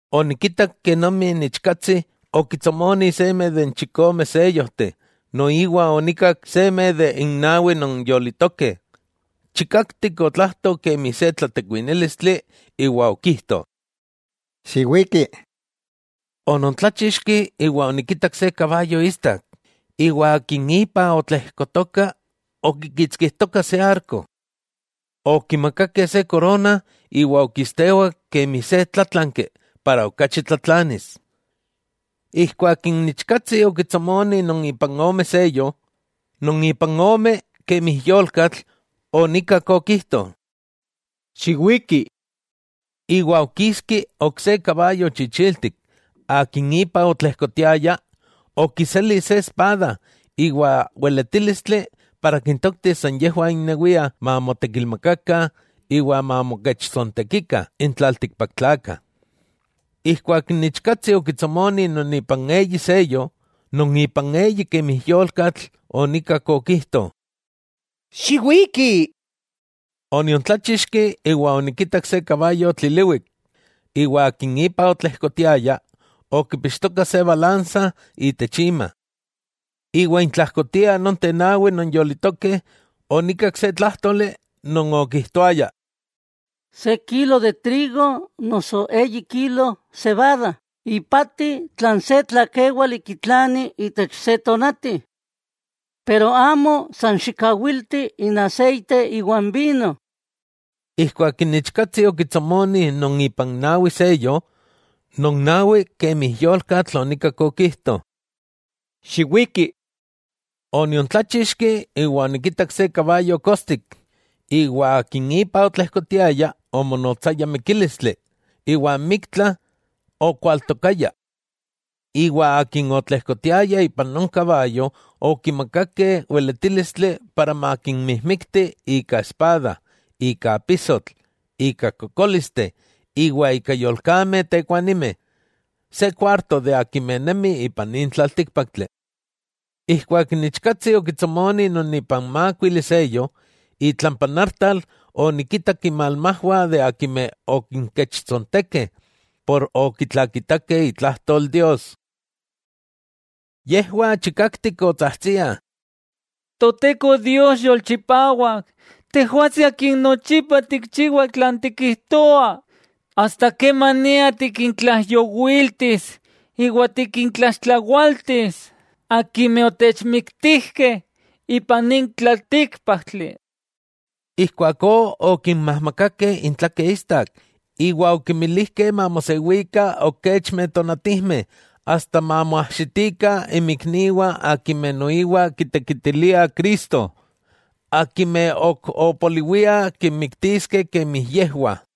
Onikitak kenomi n Ichkatsi okitsomoni seme de n chikome seyojteh, noiwa onikak seme de n nawi non yolitokeh, chikaktik otlajto kemi se tlatekuinílistli iwa okijto: —¡Xiwiki! Onontláchixki iwa onikitak se kabayo istak, iwa akin ipa otlejkotoka okikitskijtoka se arko. Okimakakeh se korona, iwa okistewak kemi se tlátlanki para okachi tlatlanis. Ijkuak n Ichkatsi okitsomoni non ipan ome seyo, non ipan ome kemi yolkatl, onikak okijto: —¡Xiwiki! Iwa okiski ok se kabayo chichiltik, akin ipa otlejkotiaya okiseli se espada iwa weletílistli para kintoktis san yejwah innewiah mamotekilmakakah iwa mamokechtsojtsontekikah n tlaltikpaktlakah. Ijkuak n Ichkatsi okitsomoni non ipan eyi seyo, non ipan eyi kemi yolkatl onikak okijto: —¡Xiwiki! Oniontláchixki, iwa onikitak se kabayo tliliwik, iwa akin ipa otlejkotiaya okipixtoka se balansa itech ima. Iwa intlajkotiah nonteh nawi non yolitokeh, onikak se tlájtoli non okijtoaya: —Se kilo trigo noso eyi kilo sebada ipati tlan se tlakéwali kitlani itech se tonati. Pero amo san xikawilti n aseite iwa n vino. Ijkuak n Ichkatsi okitsomoni non ipan nawi seyo, non nawi kemi yolkatl onikak okijto: —¡Xiwiki! Oniontláchixki iwa onikitak se kabayo kostik, iwa akin ipa otlejkotiaya omonotsaya Mikílistli, iwa n Miktla okualtokaya. Iwa akin otlejkotiaya ipan non kabayo okimakakeh weletílistli para makinmijmikti ika espada, ika apisotl, ika kokólisteh iwa ika yolkameh tekuanimeh, se kuarto de akimeh nemi ipan nin tlaltíkpaktli. Ijkuak n Ichkatsi okitsomoni non ipan mákuili seyo, itlampa n artal onikitak inmalmajwah akimeh okinkechtsontekeh por okitlakitakeh itlajtol Dios. Yejwah chikaktik otsajtsiah: —Toteko Dios Yolchipawak Tejwatsi Akin nochipa tikchiwa tlan tikijtoa, ¿asta kemania tikintlaijyowiltis iwa tikintlaxtlawaltis akimeh otechmiktijkeh ipan nin tlaltíkpaktli? Ijkuakó okinmajmakakeh intlakeh istak, iwa okimilijkeh mamosewikah ok kechmeh tonatijmeh, asta mamoajxitikah inmikniwah akimeh noiwa kitekitiliah Cristo, akimeh ok opoliwiah kinmiktiskeh kemi yejwah.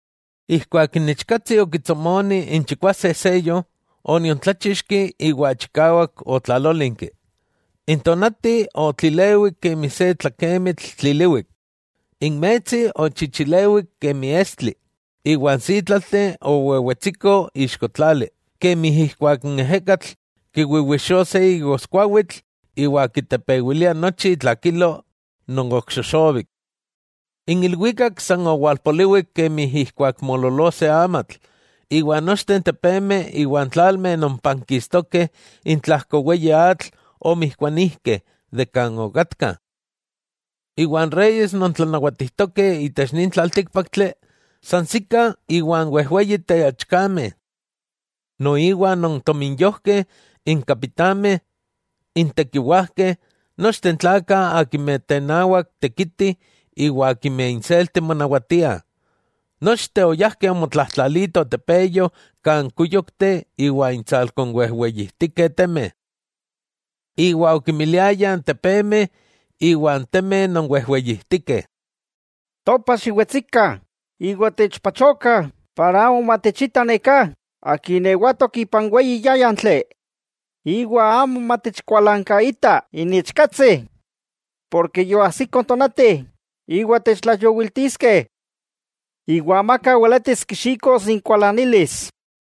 Ijkuak n Ichkatsi okitsomoni n chikwase n seyo, oniontláchixki, iwa chikawak otlalólinki. N tonati otlilewik kemi se tlakemitl tliliwik, n metsi ochichilewik kemi estli, iwa n sítlalteh owewetsikoh ixko tlali, kemi ijkuak n ejekatl kiwiwixoa se igoskuawitl iwa kitepewilia nochi itlakilo non ok xoxobik. N ilwikak san owalpoliwik kemi ijkuak moololoa se amatl, iwa nochteh n tepemeh iwa n tlalmeh non pankistokeh itlajko n weyi atl omijkuanijkeh de kan okatkah. Iwa n reyes non tlanawatijtokeh itech nin tlaltíkpaktli, sansikah iwa n wejweyi teachkameh, noiwa non tominyojkeh, n kapitameh, n tekiwajkeh, nochteh n tlakah akimeh tenawak tekitih iwa akimeh inselti monawatiah, nochteh oyajkeh omotlajtlaatitoh tepeyo kan kúyokteh iwa intsalko n wejweyijtikeh temeh. Iwa okimiliayah n tepemeh iwa n temeh non wejweyijtikeh: —¡Topa xiwetsikah, iwa techpachokah para amo matechita neká Akin ewatok ipan weyi yáyantli, iwa amo matechkualankaita n Ichkatsi, porke yoajsiko n tonati iwa techtlaijyowiltiskeh! ¡Amaka weletis kixikos inkualanilis!